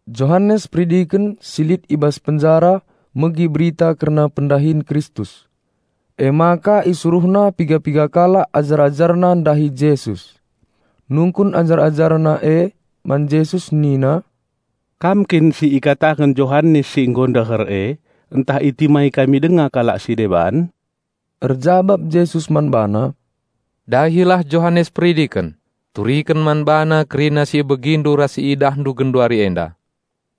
Johanes Peridiken si lit i bas penjara megi berita kerna pendahin Kristus. Emaka isuruhna piga-piga kalak ajar-ajarna ndahi Jesus. Nungkun ajar-ajarna e man Jesus nina, "Kam kin si ikataken Johanes si nggo ndeher e ntah itimai kami dengan kalak si deban?" Erjabap Jesus man bana, "Dahilah Johanes Peridiken, turiken man bana kerina si ibegindu ras iidahndu genduari enda;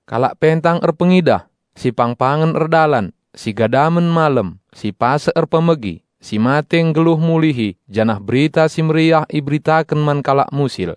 kalak pentang erpengidah, si pang-pangen erdalan, si gadamen malem, si pasek erpemegi, si mate nggeluh mulihi janah Berita Si Mehuli iberitaken man kalak musil.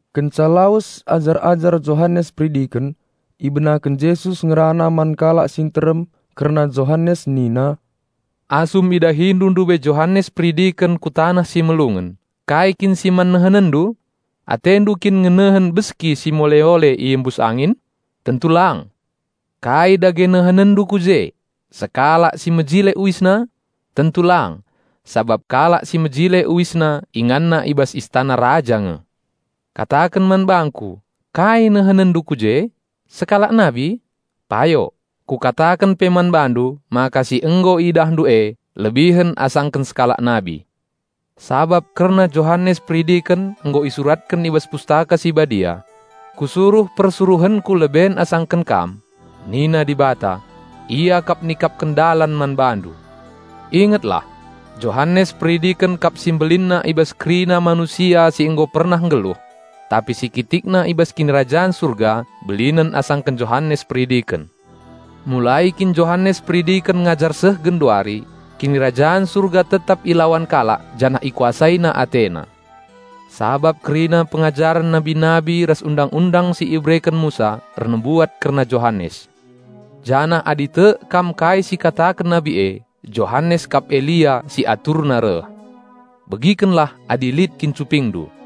Kenca lawes ajar-ajar Johanes Peridiken, ibenaken Jesus ngerana man kalak si nterem kerna Johanes nina, "Asum idahindu mbaru enda Johanes Peridiken ku taneh si melungun, kai kin min atendu nehenenndu? Atendu kin ngenehen dukut si iembus angin? Tentu lang! Kai dage nehenenndu ku je? Sekalak si mejile uisna? Tentu lang, sabap kalak si mejile uisna inganna i bas istana raja nge. Kataken man bangKu, kai nehenenndu ku je? Sekalak nabi? Payo, Kukataken pe man bandu maka si nggo idahndu e lebihen asangken sekalak nabi. Sabap kerna Johanes Peridiken nggo isuratken i bas Pustaka Si Badia, 'Kusuruh persuruhenKu leben asangken Kam,' nina Dibata, 'Ia kap nikapken dalan man bandu.' Ingetlah! Johanes Peridiken kap si mbelinna i bas kerina manusia si nggo pernah nggeluh. Tapi si kitikna i bas Kinirajan Surga belinen asangken Johanes Peridiken. Mulai kin Johanes Peridiken ngajar seh genduari, Kinirajan Surga tetap ilawan kalak janah ikuasaina atena. Sabap kerina pengajaren nabi-nabi ras Undang-undang si ibereken Musa ernubuat kerna Johanes. Janah adi tek kam kai si ikataken nabi e, Johanes kap Elia si aturna reh. Begikenlah, adi lit kin cupingndu!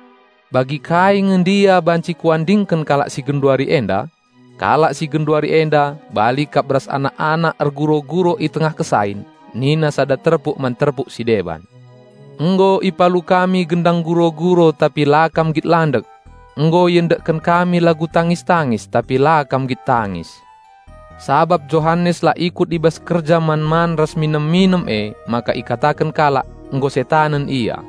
Bagi kai nge ndia banci Kuandingken kalak si genduari enda? Kalak si genduari enda bali kap ras anak-anak erguro-guro i tengah kesain. Nina sada terpuk man terpuk si deban, 'Nggo ipalu kami gendang guro-guro tapi la kam nggit landek. Nggo iendeken kami lagu tangis-tangis tapi la kam nggit tangis!' Sabap Johanes la ikut i bas kerja man-man ras minem-minem emaka ikataken kalak, 'Nggo setanen ia!'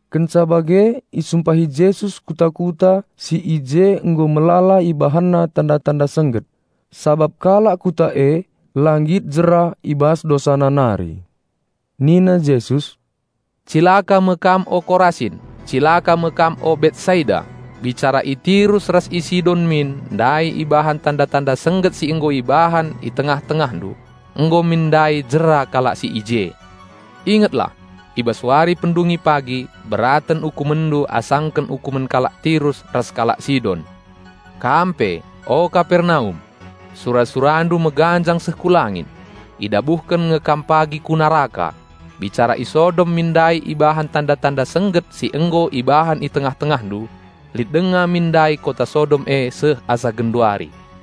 Kenca bage isumpahi Jesus kuta-kuta si i je nggo melala IbahanNa tanda-tanda sengget, sabap kalak kuta e la nggit jera i bas dosana nari. Nina Jesus, "Cilaka me kam o Korasin! Cilaka me kam o Betsaida! Bicara i Tirus ras i Sidon min ndai ibahan tanda-tanda sengget si nggo ibahan i tengah-tengahndu, nggo min ndai jera kalak si i je. Ingetlah! I bas wari pendungi pagi beraten ukumenndu asangken ukumen kalak Tirus ras kalak Sidon. Kam pe, o Kapernaum! Sura-surandu meganjang seh ku langit. Idabuhken nge kam pagi ku neraka! Bicara i Sodom min ndai ibahan tanda-tanda sengget si nggo ibahan i tengah-tengahndu, lit denga min ndai Kota Sodom e seh asa genduari.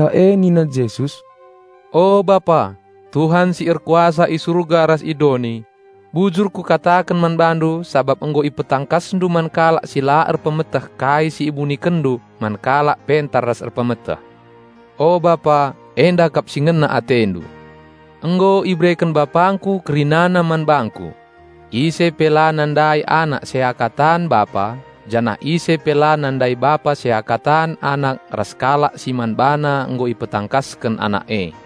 Paksa e nina Jesus, "O Bapa, Tuhan si erkuasa i Surga ras i doni! Bujur Kukataken man BaNdu sabap nggo IpetangkasNdu man kalak si la erpemeteh kai si IbunikenNdu man kalak pentar ras erpemeteh. O Bapa, enda kap si ngena AteNdu." "Nggo ibereken BapangKu kerinana man bangKu. Ise pe la nandai Anak seakatan Bapa, janah ise pe la nandai Bapa seakatan Anak ras kalak si man bana nggo ipetangkasken Anak e."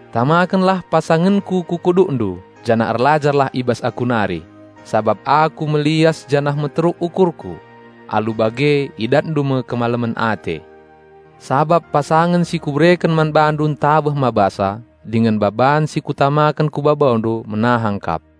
Tamakenlah pasangenKu ku kudukndu janah erlajarlah i bas Aku nari. Sabap Aku melias janah meteruk ukurKu; alu bage idatndu me kemalemen ate. Sabap pasangen si Kubereken man bandu ntabeh mabasa, dingen baban si Kutamaken ku babondu menahang kap."